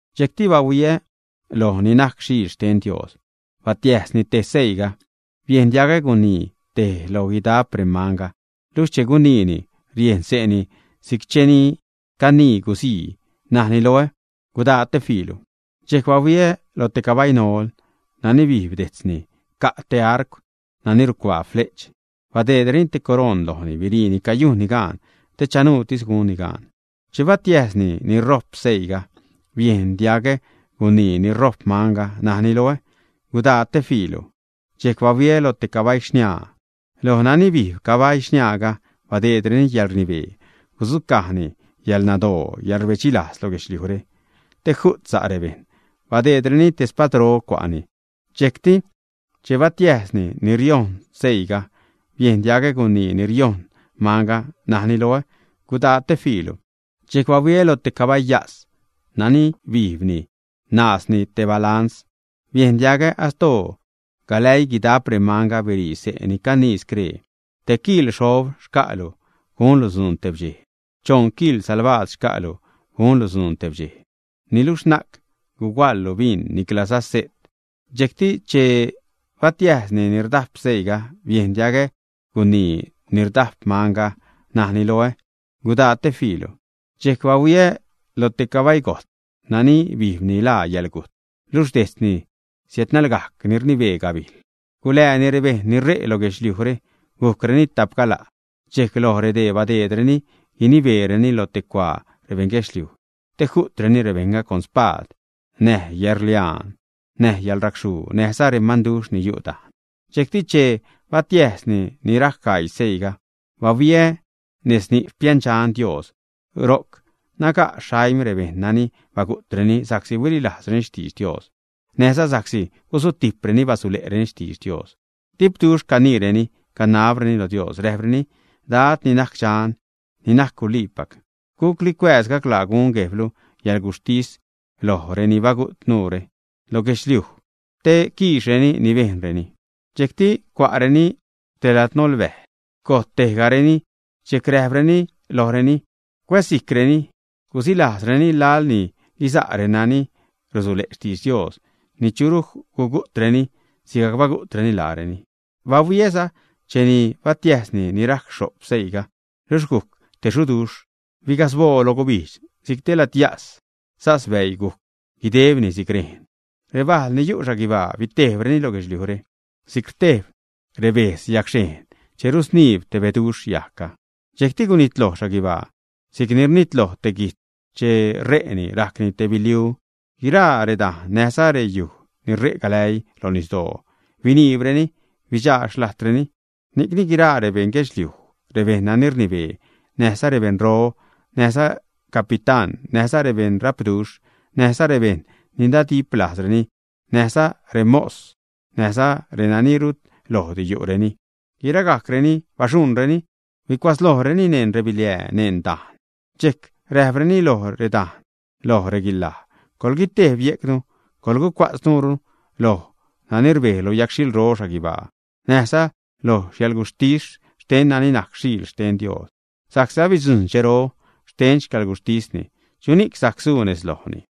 Dxejcti bahuiä loj ni najc Xiil xten Dios. Batiäjsni tej seiiga. Biejn diagä gunii tej lo guidap remanga, luxh che guniini riejn xse'ni si'c che ni canii guzii, najni loä: ―Gudaa te fiilu. Dxejc bahuiä lo te cabai nol. Nani bijb dejtzni ca' te arcw nani rucuaa fle'ch. Badeedreni te coroṉ lojni. Biriini cayujnni gaan te chanuutis gunni gaan. Che batiäjsni ni rojp seiiga, biejn diagä gunii ni rojp manga, najni loä: ―Gudaa te fiilu. Dxejc bahuiä lo te cabai xniaa. Loj nani bijb cabai xniaaga badeedreni yäḻrnibee gudzucajni yäḻnadoo, yäḻrbedxilajz, lo guedxliujre, te ju't sa' rebejṉ. Badeedreni te spadro cua'ni. Dxejcti che batiäjsni ni riojṉ seiiga, biejn diagä gunii ni riojṉ manga, najni loä: ―Gudaa te fiilu. Dxejc bahuiä lo te cabai yas. Nani bijbni naazni te balans. Biejn diagä astoo galäii guidap remanga, birii xse' te ni canii scree: ―Tej kiḻ xob xca'lu gunlu dzuun tebdxej; choṉ kiḻ salbaad xca'lu gunlu dzuun tebdxej. Niluxh na'c guhuaḻlu bin niclaza se't. Dxejcti che batiäjsni ni rdap seiiga, biejn diagä gunii ni rdajp manga, najni loä: ―Gudaa te fiilu. Dxejc bahuiä lo te cabai gojtz. Nani bijbni laa yäḻgujt, luxh dejtzni siädnalgajc ni rnibee gabijl. Gula'ni rebejṉ ni re' lo guedxliujre gujcreni tajp gala', dxejc loj redee badeedreni guinibeereni lo te cuaa rebeṉguedxliuj te ju'treni rebejṉga con spaad, näj yäḻrliaan, näj yäḻracxhuu, näjza remanduxh ni yu' dajn. Dxejcti che batiäjsni ni rajc gaii seiiga, bahuiä nez ni' xpiändxan Dios, ro'c naga' xaim rebejṉ nani bagu'treni sa'csi huililajzreni xtidx Dios, näjza sa'csi gusutijpreni basule'reni xtidx Dios. Dipduxh caniireni, canabreni lo Dios, räjpreni: ―Dad, ni najc Dxan, ni najc guliipac. ¿Gucli cuääz, gaclaa gun Guejblu yäḻguxhtis loj reni bagu't nuure lo guedxliuj te quiixreni ni bejnreni? Dxejcti cua'reni te ladnolbäj gojt tejgareni. Dxejc räjpreni lojreni cuäzsijcreni, gusilajzreni, laḻ ni guiza' resa'reni ni rusule' xtidx Dios, ni churu gugu'treni sigajc bagu'treni laareni. Bahuiäza cheni batiäjsni ni rajc xho'p seiiga, luxh gujc te xuduxh, bigasboo loj gubijdx si'c te ladyas, sas bäii gujc guidebni si'c rejn. Rebajl ni yu' xhaguibaa bitejbreni lo guedxliujre, si'c rtejb rebetz yagxhejṉ che rusniib te beduxh yajgga. Dxejcti gunitloj guibaa si'cni rnitloj te guijtz che ṟe'ni, rajcni te biliu. Guiraa redajn näjza reyuj ni re' galäii lo nisdoo biniibreni, bidxaa xlajdreni. Ni'cni guiraa rebeṉ guedxliuj, rebejṉ nani rnibee, näjza rebeṉro, näjza recapitán, näjza rebeṉ rapduxh, näjza rebeṉ ni nadiplajzreni, näjza remos, näjza renani rut lojdi yu'reni, guiragajcreni baxuṉreni, huicuatzlojreni neṉ rebiliää neṉ redajn. Dxejc räjpreni loj redajn, loj reguilaj: ―Coḻguitejb yejcnu, coḻgucua'tz nuure loj nani rbej lo yagxhilro xhaguibaa näjza loj yäḻguxhtis xten nani najc Xiil xten Dios. Sa'csi abidzujṉ dxero xten xcäḻguxhtisni, ¿chuni'c sajc suu nez lojni?